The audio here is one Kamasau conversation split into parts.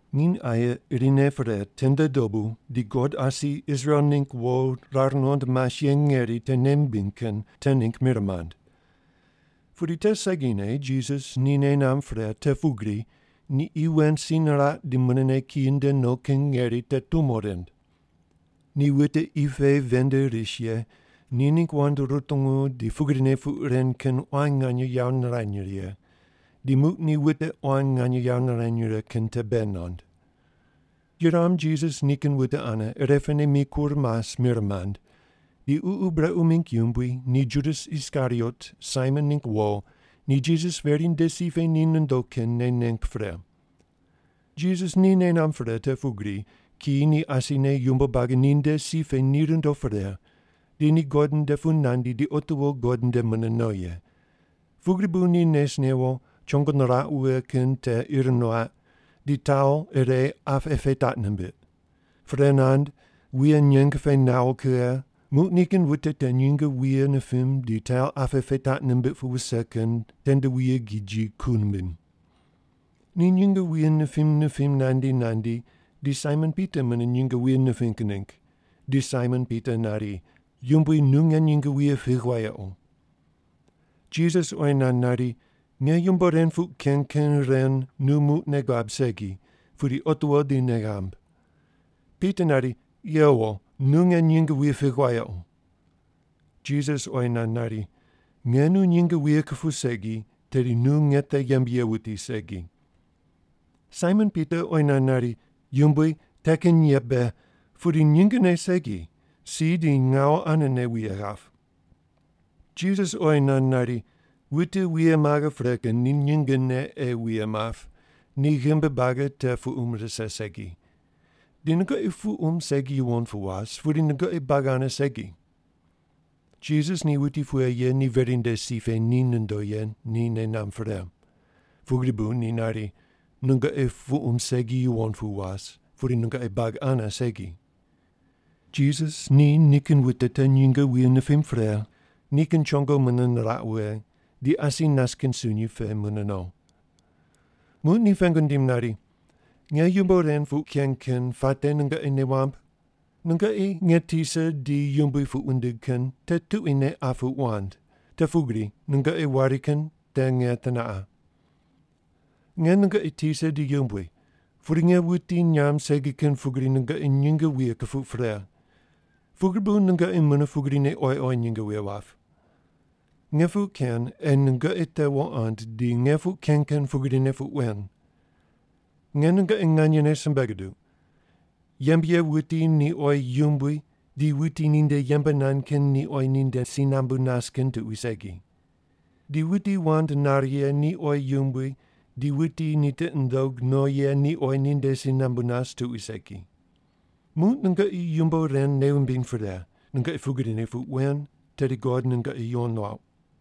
Nginy aye irine pre tende dobu di God asi Israel mingg wo rar nuqond mas ye ngeri te nei mimbiny kin te ningg mir mand. Pudi te segine Jisas ni nei namb pre te pugri ni qi wen si niraq di munene kiyi nde no kin ngeri te tumo rind. Ni wute qi pe ven nde ris ye ni ningg wand rutungu di pugrine puq ren kin quan nganye yawo nirany righe, di muq ni wute quan nganye yawo nirany righe kin te bei nand. Yuram Jisas nikin wute ane irepene mikur mas mir mand, di ququ brequ mingg yumbui ni Judas Iskariot, Saimon ningg wo, ni Jisas veri nde si pe ni nondo kin nei neng pre. Jisas ni nei namb pre te pugri kiyi ni asine yumbo buagi ninde si pe ni rundo pre, di ni God nde pu nandi di otiwo God nde mune no ye, pugri bu ni nes newo chongo niraq wughe kin te ir nuaq, di taul ire apqe pe taq nimbiq. Pre nand, wuye nyeng pe nawo kughe, muq nikin wute te nyinge wuye nipim di taul apqe pe taq nimbiq pu wuse kin tende wuye giji ku nimbim. Ni nyinge wuye nipim nipim nandi nandi di Saimon Pita mune nyinge wuye niping ningg, di Saimon Pita nari, “Yumbui nu nge nyinge wuye pigh wayequ.” Jisas oyi nand nari, “Nge yumbo ren puq ken kin ren nu muq nei guab segi, pudi otiwo di nei ghamb.” Pita nari, “Yewo, nu nge nyinge wuye pigh wayequ.” Jisas oyi nand nari, “Nge nu nyinge wuye kupuw segi, tedi nu nge te yembe ye wuti segi.” Saimon Pita oyi nand nari, “Yumbui, te kin ye be, pudi nyingene segi, si di ngawu anene wuye ghap!” Jisas oyi nand nari, “Wute wuye maghe pre kin ni nyingene ei wuye map, ni ghimbi buagi te puqum rise segi. Di nungoqi puqum segi yuwon pu was, pudi nungoqi buagi ane segi.” Jisas ni wuti pughe ye ni veri nde si pe ni nondo ye ni nei namb pre, pugri bu ni nari, “Nungoqi puqum segi yuwon pu was, pudi nungoqi buagi ane segi.” Jisas ni nikin wute te nyinge wuye nipim pre, nikin chongo mune niraq wughe, di asi nas kin sunyi pe mune no. Muq ni pengu nindim nari, “Nge yumbo ren puq ken kin puate nungoqi nei wamb? Nungoqi nge tisa di yumbui puq wundigh kin te tuquine qa puq wand, te pugri nungoqi wari kin te nge teneqa. Nge nungoqi tisa di yumbui, pudi nge wuti nyamb segi kin pugri nungoqi nyinge wuye kupuq pre, pugri bu nungoqi mune pugrine oyi oyi nyinge wuye wap. Nge puq ken ei nungoqi te wuqond di nge puq ken kin pugrine puq wen. Nge nungoqi nganyene simbe guduq, yembe ye wuti ni oyi yumbui di wuti ninde yembe nand kin ni oyi ninde si nambu nas kin tuqui segi. Di wuti wand nare ye ni oyi yumbui di wuti ni tiqi nundog no ye ni oyi ninde si nambu nas tuqui segi. Muq nungoqi yumbo ren nei wumbiny pre, nungoqi pugrine puq wen tedi God nungoqi yuwon nuauq.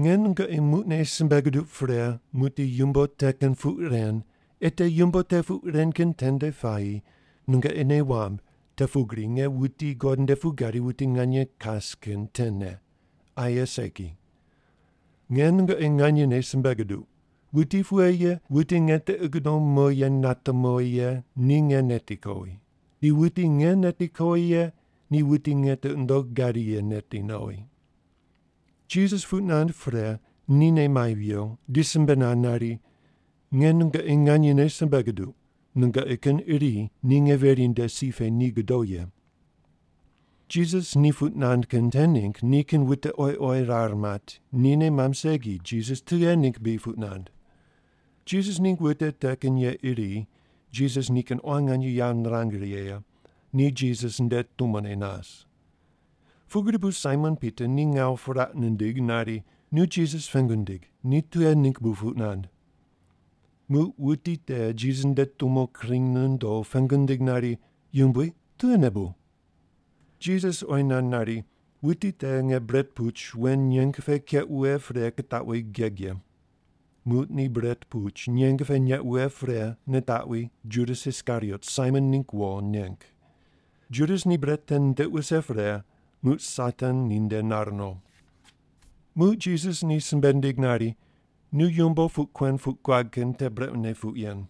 “Nge nungoqi muqne simbe guduq pre muqdi yumbo te kin puq ren, ei te yumbo te puq ren kin tende puayi nungoqi nei wamb te pugri nge wuti God nde pu gadi wuti nganye kas kin tene, aye segi. Nge nungoqi nganyene simbe guduq, wuti pughe ye wute nge tiqi gudom mo ye nate mowi ye ni nge neti kowi, di wuti nge neti kowi ye ni wuti nge tiqi nundogh gadi ye neti nowi.” Jisas puq nand pre, ni nei mai viwo, di simbe nand nari, “Nge nungoqi nganyene simbe guduq, nungoqi kin iri ni nge veri nde si pe ni godo ye.” Jisas ni puq nand kin te ningg nikin wute oyi oyi rar mat, ni nei mamb segi Jisas tughe ningg bri puq nand. Jisas ningg wute te kin ye iri, Jisas nikin quan nganye yawo nirang righe ye, ni Jisas nde tumone nas. Pugri bu Saimon Pita ni ngawu puraq nindig nari, “Nu Jisas pengu ndig, ni tughe ningg bu puq nand.” Muq wuti te Jisas nde tumo kring nondo, pengu nindig nari, “Yumbui, tughene bu?” Jisas oyi nand nari, “Wuti te nge bret puch wen nyeng pe keq wughe pre kitaqwi geg ye.” Muq ni bret puch nyeng pe neq wughe pre nitaqwi Judas Iskariot, Saimon ningg wo neng. Judas ni bret te nitiq wuse pre, muq Satan ninde nar no. Muq Jisas ni simbe nindig nari, “Nu yumbo puq kuen puq guad kin te brequne puq yen.”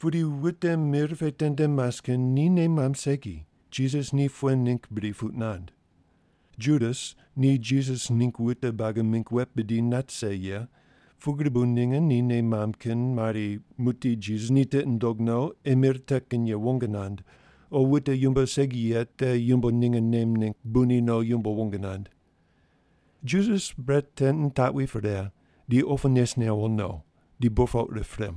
Pudi wute mir pe tende mas kin ni nei mamb segi, Jisas ni pughe ningg bri puq nand. Judas ni Jisas ningg wute buagi mingg wet bidi nat rise ye, pugri bu ninge ni nei mamb kin mari muqdi Jisas ni tiqi nundog no ei mir te kin ye wong nand, o wute yumbo segi ye te yumbo ninge nem ningg bu ni no yumbo wong nand. Judas bret te nitaqwi pre, di opu nes newo no. Di burpoq rip pre.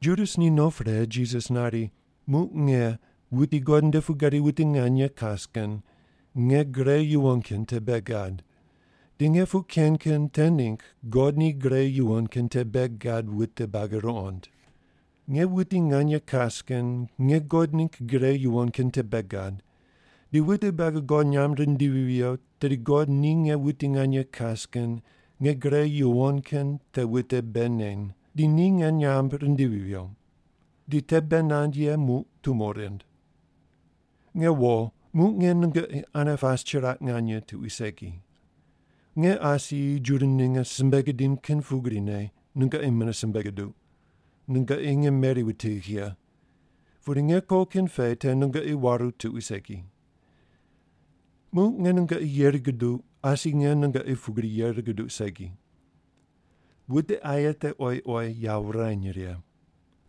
Judas ni no pre, Jisas nari, “Muq nge, wuti God nde pu gadi wuti nganye kas kin, nge gre yuwon kin te bei gad, di nge puq ken kin te ningg God ni gre yuwon kin te bei gad wute buagi ruqond. Nge wuti nganye kas kin nge God ningg gre yuwon kin te bei gad, di wute buagi God nyamb rindivi viyo tedi God ni nge wuti nganye kas kin nge gre yuwon kin te wute bei neny, di ni nge nyamb rindivi viyo. Di te bei nand ye muq tumo rind. “Nge wo, muq nge nungoqi ane pas chiraq nganye tuqui segi. Nge asi Juda ninge simbe gidim kin pugrine nungoqi mune simbe guduq, nungoqi nge meri wutigh ye. Pudi nge ko kin pe te nungoqi waru tuqui segi. “Muq nge nungoqi yeri guduq, asi nge nungoqi pugri yeri guduq segi. Wute aye te oyi oyi yawo wurany righe.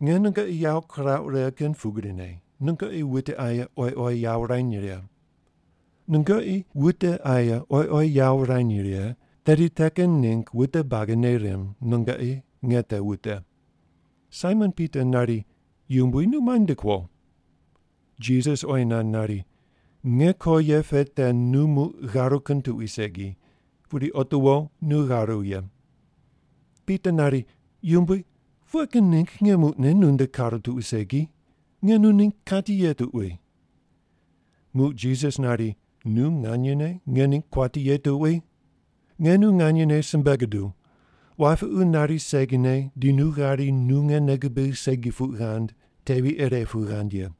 Nge nungoqi yawo kirauq righe kin pugrine nungoqi wute aye oyi oyi yawo wurany righe. Nungoqi wute aye oyi oyi yawo wurany righe, tedi te kin ningg wute buagi nei rimb nungoqi nge te wute.” Saimon Pita nari, “Yumbui, nu muai nde kuo?” Jisas oyi nand nari, “Nge ko ye pe te nu muq gharu kin tuqui segi, pudi otiwo nu gharu ye.” Pita nari, “Yumbui, pughe kin ningg nge muqne nu nde karu tuqui segi? Nge nu ningg kati ye tuqui.” Muq Jisas nari, “Nu nganyene nge ningg kuati ye tuqui? Nge nu nganyene simbe guduw, wapiqu nari segine di nu ghari nu nge nei gubigh segi puq ghand tevi ire pu ghand ye.”